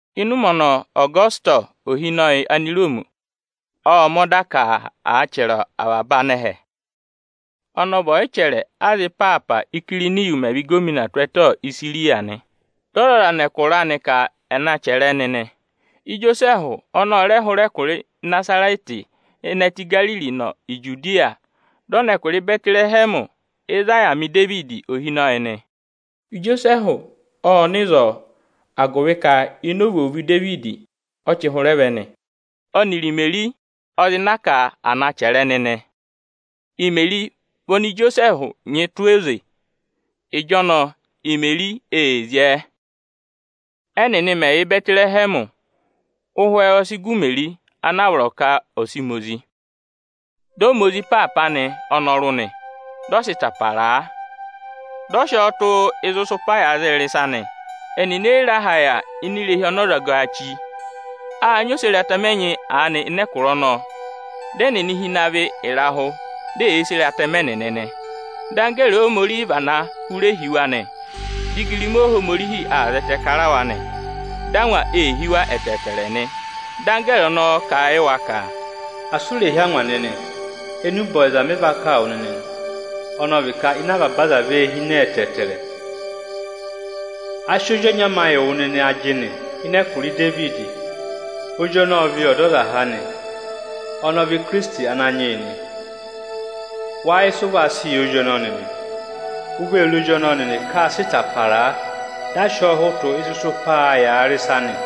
Ịnị ụmẹ ọnọọ, Ọgọsịtọsị ohinọyị Aniroomi ộ mẹ̀ ọda ka à chẹrẹ avaba anẹhẹ. Ọnọọ ọ vị ọyịchẹrẹ aza ịpaapa, Íkiriniyu mẹ̀ vị ịgọvọnọ tụ́ ẹtẹ Isiriya nị. Dị ọzọza nọ ẹkụra anị ka à na chẹrẹ ẹnị nị. Ijosẹẹhụ ọnị ọ rẹ hụrẹ ẹkụra Ịnazarẹtị ịnị ẹtẹ Igariri nọ Ijudiya, dị ọ nọ ẹkụra Ịbẹtịrẹhẹmị ịzị a yà ma Idevidi ohinọyị nị. Ijosẹẹhụ ộ nọ ịzọọ, agụvị ka ini ovwoovu Idevidi ọ chị hụrẹ vẹ nị. Ọnịrị Imeri ọ zị na ka à na chẹrẹ ẹnị nị. Imeri vị oni Ijosẹẹhụ nyị tụ́ oze. Ịjọnọọ, Imeri ee zyẹẹ. Ẹnịnị mẹ̀ yà Ịbẹtịrẹhẹmị, ụhwẹ ọ sị gụ Imeri ana a vọrọ ka ọ̀ sị ma ozi. Dị ọ ma ozi ịpaapa anị ọnọrụ nị, dị ọ sị ịta para a, dị ọ sị ọọ tụ́ ịzị ịsụpaā yàa rị ịsa nị. Ẹnịnị e yi re aha yà ini irehi ọnị ọzọgaā chí. Â nyị oseratẹmẹ ẹnyị aanị ịnị ẹkụra ọnọọ. Dị ẹnịnị hi ịnị avị ịrahụ, di eyee sere atẹmẹ ẹnịnị nị. Dị anggẹẹrị Ohomorihi vana hụrẹ hi wa nị; dị igirima Ohomorihi aa zẹtẹẹ kara wa nị. Dị angwa ee hí wa ẹtẹẹtẹrẹ nị. Dị anggẹẹrị ọnọọ kà a yị wa ka, “Asị u rè hí angwa nịnị! Enube ọyịza mị va kà wụ nịnị nị, ọnị ọ vị ka ịnẹ avaba aza vee hine ẹtẹẹtẹrẹ. A sị ozi ọnya ma yị wụ nịnị ajịnị tụ́ ịnị ẹkụra Idevidi. Ozi ọnọọ ọ vị Ọdọzaha nị, ọnị ọ vị Ikirisiti Ananyị yị nị. Wáá yẹ ịsị ụ va sị yẹ ozi ọnọọ nịnị? U vee re ozi ọnọọ nịnị ka â sị ịta para a, dị a sị ọọ hụtụ ịzị ịsụpaā yàa rị ịsa nị.”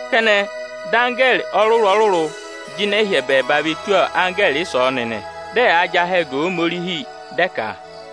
Kẹnẹ, dị anggẹẹrị ọrụrụ-ọrụrụ jịnẹ hụrẹ ẹbẹẹba ve tù anggẹẹrị ịsọọnị nị. Dị ẹyaa jị ahẹ ga Ohomorihi, dị ẹ ka: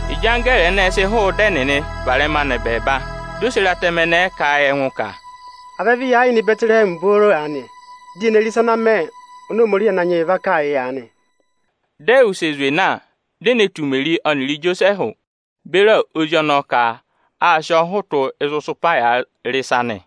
Ịjị anggẹẹrị ẹnẹẹ sị hụụ ịdị ẹnịnị varẹma nọ ẹbẹẹba, di oseratẹmẹ ẹnẹẹ kà a yị ẹngụ ka, “À vẹ vị ya yịị nọ Ịbẹtịrẹhẹmị booro aanị, di ye ne re ịsa ana mẹ, oni Ohomorihi Ananyị yị va kà yị aanị.” Dị ẹ wụsẹ zwe na, di e ne tù Imeri ọnịrị Ijosẹẹhụ beri ozi ọnọọ ka â sị ọọ hụtụ ịzị ịsụpaā yàa rị ịsa nị.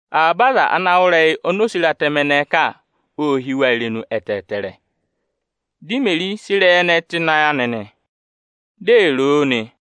Avaba aza ana wụ́ ịrẹyị oni oseratẹmẹ ẹnẹẹ kà, ô hí wa irenu ẹtẹẹtẹrẹ. Dị Imeri sị ịrẹyị ẹnẹẹ tụ́ ịnị ayị anị, di ee ro o nị.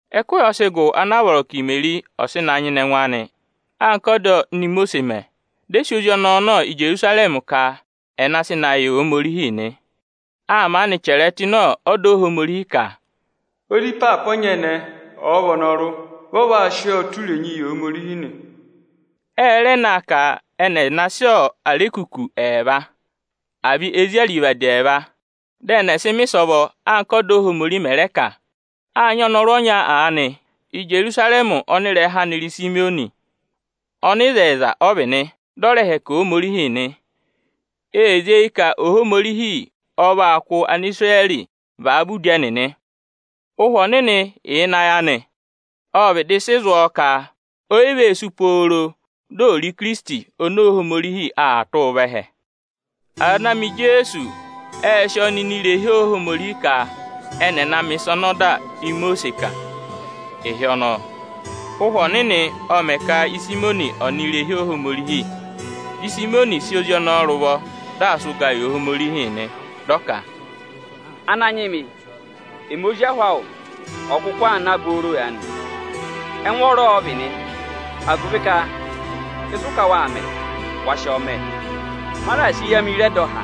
Ẹkụhị ọ sị gụ ana a vọrọ ka Imeri ọ̀ sị na nyịna ẹngụ anị anka ọda oni Imosiisi mẹ, dị ẹ sị ozi ọnọọ nọ Ijerusarẹmị ka ẹnị ẹ̀ sị na yị Ohomorihi nị. Â maanị chẹrẹẹ tụ́ ịnị ọda Ohomorihi ka, “Ozi ịpaapa ọnyẹnẹẹ, ọ̀ọ vị ọnọrụ, vị ọ vaa sị ọọ tụ́ irenyii yị Ohomorihi nị.” Ẹ rẹ na ka ẹnị ẹ̀ na sị arekuku ẹẹva, àa vị ezi arivadi ẹẹva, dị ẹnị ẹ̀ sị mẹ̀ ịsọvọ, anka ọ́da Ohomorihi mẹ̀ rẹ kà a. Â nyị ọnọrụ ọnya aanị Íjerusarẹmị ọnị ịrẹha anị rị Isimiyọnị. Ọnịzẹyịza ọ vị nị, dị ọ rẹẹ̄ hẹkẹ Ohomorihi nị. Ee zí eyi ka Ohomorihi ọ̀ va kụ́ Anisirẹrị vavẹ udi ẹnịnị. Ụhwẹ Ọnịnị yà ịnị ayị anị. Ộ vịdị sị zụ̀ ọ ka o yi vee sú pooro di ò re Ikirisiti oni Ohomorihi aa tụ́ụ vẹ ẹhẹ. Aza ana ma Ijeesu ệ sị ọọ nọ ini irehi Ohomorihi ka ẹnị ẹ̀ na mẹ̀ ịsa ọnị ọda Imosiisi kà. Ịhị ọnọọ, Ụhwẹ Ọnịnị ộ mẹ̀ ka Isimiyọnị ọ̀ nọ ini irehi Ohomorihi. Dị Isimiyọnị sị ozi ọnọọ rị ụvọ, dị aa sị ụgaa yị Ohomorihi nị, dị ọ ka: “Ananyị mị, ẹmị ozi ahụ awụ ọ̀ọ kụkụ aa na booro aanị, ẹngwọọrọ ọ vị nị, agụvị ka ịsị ụ ka waa mẹ, wa sị ọọ mẹ. Ma raà sị eyi amị re ẹdọha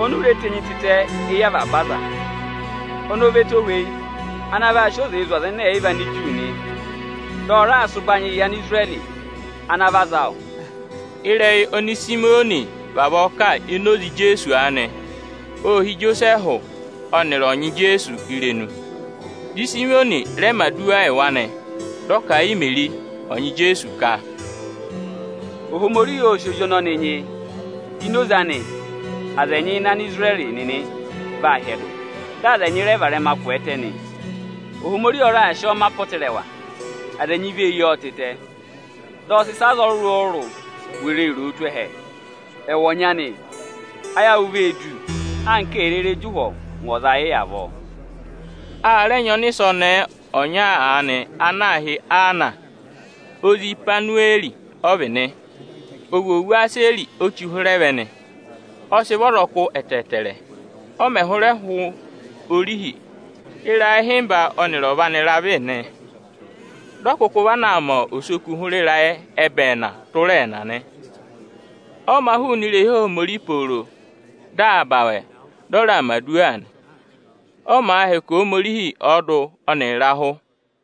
oni u reè tenyi tịtẹ éyi avaba aza. Ọnị ọ va ẹtohweyi ana vaa sị oze zụ̀ Anigiriki nị, dị ọ raa sị ụbanyịị yị Anisirẹrị ana vị aza awụ.” Ịrẹyị oni Isimiyọnị vavọọ kà ini oze Ijeesu aanị, ô hí Ijosẹẹhụ ọnịrị ọnyị Ijeesu irenu. Dị Isimiyọnị rẹ mẹ̀ aduwa yị wa nị. Dị ọ kà a yị Imeri ọnyị Ijeesu ka, “Ohomorihi ọ sị ozi ọnọnị nyị ka ini oze anị aza ẹnyị ịnị Anisirẹrị nịnị vaa yàa hyẹdụ, dị aza ẹnyị rẹ varẹma kwẹẹtẹ nị. Ohomorihi ọ raà sị ọọ mẹ apọtẹrẹwa ọnị aza ẹnyị vee yii tịtẹ; dị ọ sị ịsị aza ọrụrụ-ọrụrụ were ee roo tụ́ ẹhẹ. Ẹwụ ọnyị anị, ayị awụ vee du anka èe rere jị ụhwọ ngụ ọza ayị avọọ.” A rẹ nyị ọnịsẹ ọnẹẹ ọnya aanị ana aā hị́ Aana; ozi Ịhwanụwẹẹrị ọ vị nị. Ovwoovu Aseri ọ chị hụrẹ vẹ nị. Ọ sị vị ọzọkụ ẹtẹẹtẹrẹ. Ọ mẹ̀ hụrẹ hụ orihi, ịrayị ịhịmba ọ́nịrị ọva anị ra vị nị. Dị ọ kụkụ vana aa mẹ osoku hụrẹ ịrayị ẹbẹẹna tụra ẹẹna nị. Ọ mā hụụnị irehi Ohomorihi pooro. Dị aa ba awẹ, dị ọ raa mẹ̀ aduwa, ọ màa hẹkẹ Ohomorihi ọọdụ ọnịrị ịrahụ nị.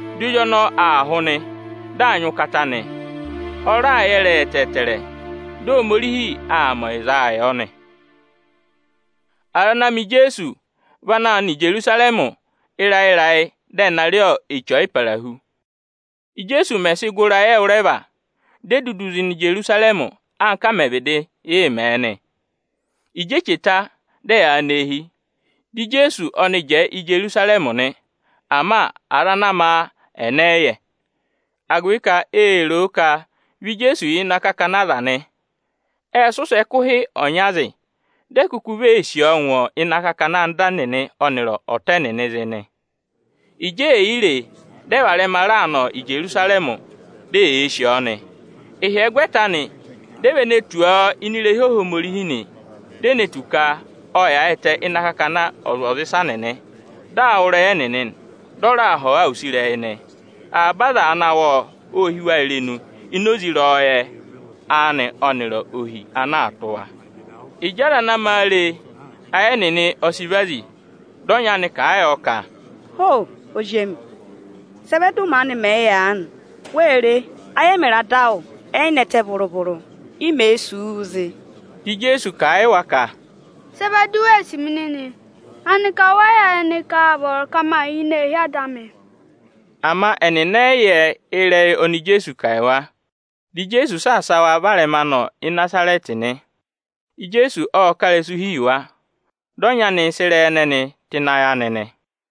Dị ozi ọnọọ aa hụ nị, dị aa nyị ụkata nị, ọ raa yẹ ịrẹyị ẹtẹẹtẹrẹ. Dị Ohomorihi aa mẹ ọyịzaa yọ nị. Aza ana ma Ijeesu vị anaā nọ Ijerusarẹmị ịrayị-ịrayị, dị ẹ̀ na rị Eche Ọyịparahu. Íjeesu mẹ̀ sị gụ ịrayị ẹwụrẹva, di e dudu zị nọ Ijerusarẹmị, anka ẹ mẹ̀ vịdị yị mẹ nị. Ịjị eche ta, dị ẹyaa nọ eehi, dị Ijeesu ọnị jẹẹ Ijerusarẹmị nị; ama aza ana ma a ẹnị ẹ yị yẹ. Agụvị ka ê ro ka vị Ijeesu yà ịnị akakana aza nị, ẹ sị ụsẹ ẹkụhị ọnya zị, di e kuku vee sì ọọ ngụ ịnị akakana anda ẹnịnị ọnịrị ọta ẹnịnịị zị nị. Ịjị è yi re e, dị ẹ varẹma raa nọ Ijerusarẹmị, di eyee sì ọọ nị. Ịhyẹgwẹta anị, di e ve ne tù ọ ini irehi Ohomorihi nị. Di e ne tù ka ộ yaayịtẹ ịnị akakana ọzwọzịsa nịnị di aa wụ́ ịrẹyị ẹnịnị, dị ọ raa họ̀ wa use ịrẹyị nị. Avaba aza ana wụ́ ịrẹyị anị, ô hí wa irenu ịnị ẹngụ ịrẹyọyẹ ọnị ọ nyị ọnịrị ohi ana aa tụ́ wa. Ịjị aza ana ma a re e, ayị ẹnịnị ẹ sị vazi. Dị ọnyị anị kà a yọ ka, “Ho! Ozi emi, sị ẹ vẹ dị ụ maanị mẹ yị aanị? Wee re, ayị ẹmịrị ada awụ ẹ yị nẹtẹ vụrụ-vụrụ, i mèe sì wu zị.” Dị Ijeesu kà a yị wa ka, “Sị ẹ vẹ di u wee sì mi nịnị? Aanịka wẹ yị yẹ nịnị ka â vọrọ ka ma yà ini eehi Ada amị?” Ama ẹnịnị ẹ yị yẹ ịrẹyị oni Ijeesu kà yị wa. Dị Ijeesu saasa wa varẹma nọ Ịnazarẹtị nị. Ijeesu ộ ká ịrẹsụ hi yị wa. Dị ọnyị anị sị ịrẹyị ẹnẹnị tụ́ ịnị ayị anị nị.